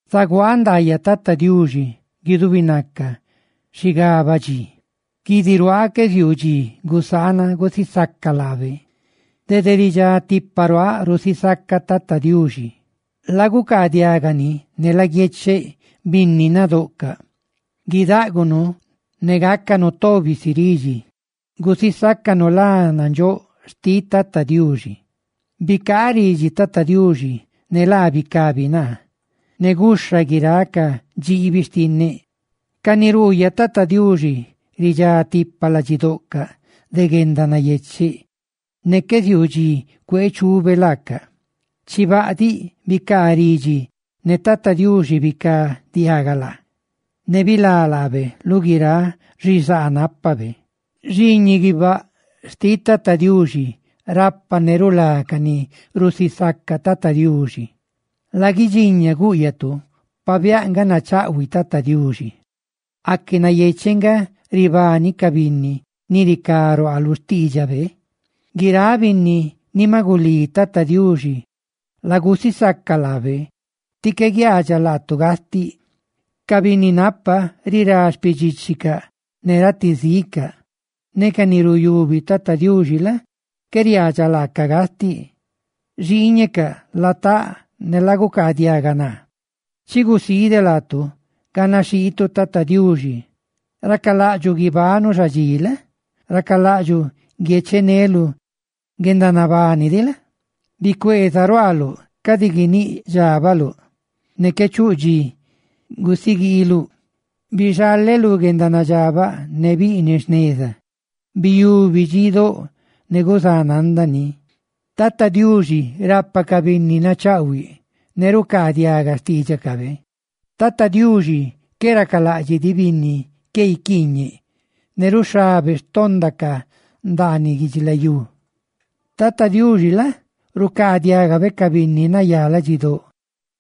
Zaguaaꞌ ndaayaꞌ Tata Diuxi guidubinaca xigabaꞌ dxi; guidiruaaꞌ qué ziuu dxí gusaanaꞌ gusisaca laabe. Dede ridxá tipaꞌ ruaaꞌ rusisacaꞌ Tata Diuxi; ¡lagucaadiaga ni ne laguiecheꞌ, binni nadoꞌcaꞌ! Guidáꞌgunu ne gácanu tobi si ridxi, gusisácanu lá nandxóꞌ xtiꞌ Tata Diuxi. Bicaaꞌ ridxi Tata Diuxi ne laa bicabi naa, ne gúxhabe guiráꞌ ca dxiibi xtinneꞌ. Ca ni ruuyaꞌ Tata Diuxi ridxá tipa ladxidoꞌcaꞌ de guendanayecheꞌ, ne qué ziuu dxi cuee chube laacaꞌ. Chibaꞌ diꞌ, bicaa ridxi ne Tata Diuxi bicaadiaga laa, ne bilá laabe lu guiráꞌ xizaa nápabe. Xiiñiꞌ guibáꞌ xtiꞌ Tata Diuxi rapa ne rulá ca ni rusisaca Tata Diuxi. Laguidxiña, gúꞌyatu, pabiáꞌ nga nachaꞌhuiꞌ Tata Diuxi. ¡Aque nayecheꞌ nga ribani ca binni, ni ricá ruaa lu xtiidxabe! Guiráꞌ binni ni maꞌ gulí Tata Diuxi, lagusisaca laabe, tí qué guiaadxaꞌ laatu gastiꞌ. Ca binni napa rirá xpidxíchicaꞌ ne ratizicaꞌ, ne ca ni ruyubi Tata Diuxi la? qué riaadxaꞌ laacaꞌ gastiꞌ. Xiiñecaꞌ, lataꞌ ne lagucaa diaga naa; chi gusiideꞌ laatu ganaxhiitu Tata Diuxi. Racalaꞌdxuꞌ guibanuꞌ xadxi la? Racalaꞌdxuꞌ guiecheneluꞌ guendanabani diꞌ la? Bicueeza ruaaluꞌ cadi guiníꞌ dxábaluꞌ, ne qué chuꞌ dxi gusiguiiluꞌ. Bixaleꞌ lú guendanadxabaꞌ ne biꞌniꞌ jneza; biyubi dxidóꞌ ne guzananda ni. Tata Diuxi rapa ca binni nachaꞌhuiꞌ, ne rucaadiaga xtídxicabe. Tata Diuxi qué racalaꞌdxiꞌ diꞌ binni qué guiquiiñeꞌ, ne ruxhabe xpandacaꞌ ndaaniꞌ guidxilayú. Tata Diuxi la? rucaadiagabe ca binni nayá ladxidóꞌ,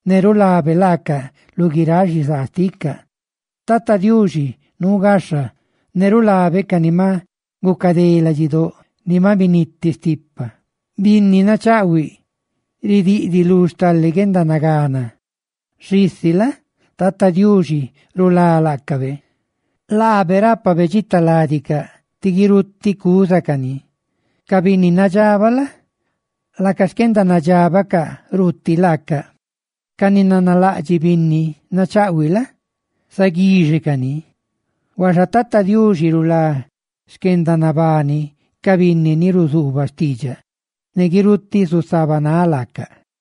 ne rulabe laaca lu guiráꞌ xizaa xticaꞌ. Tata Diuxi nuu gaxha, ne rulabe ca ni maꞌ gucadé ladxidóꞌ ni maꞌ biniti stipa. Binni nachaꞌhuiꞌ ridiꞌdiꞌ lu stale guendanagana, xisi la? Tata Diuxi rulá laacabe. Laabe rápabe dxitaládicaꞌ; ti guirutiꞌ cúzacani. Ca binni nadxabaꞌ la? laca xquendanadxabacaꞌ ruuti laacaꞌ; ca ni nanalaꞌdxiꞌ binni nachaꞌhuiꞌ la? zaguíxecaꞌ ni. Huaxa Tata Diuxi rulá xquendanabani ca binni ni ruzuubaꞌ xtiidxaꞌ; ¡ne guirutiꞌ zusabanáꞌ laaca!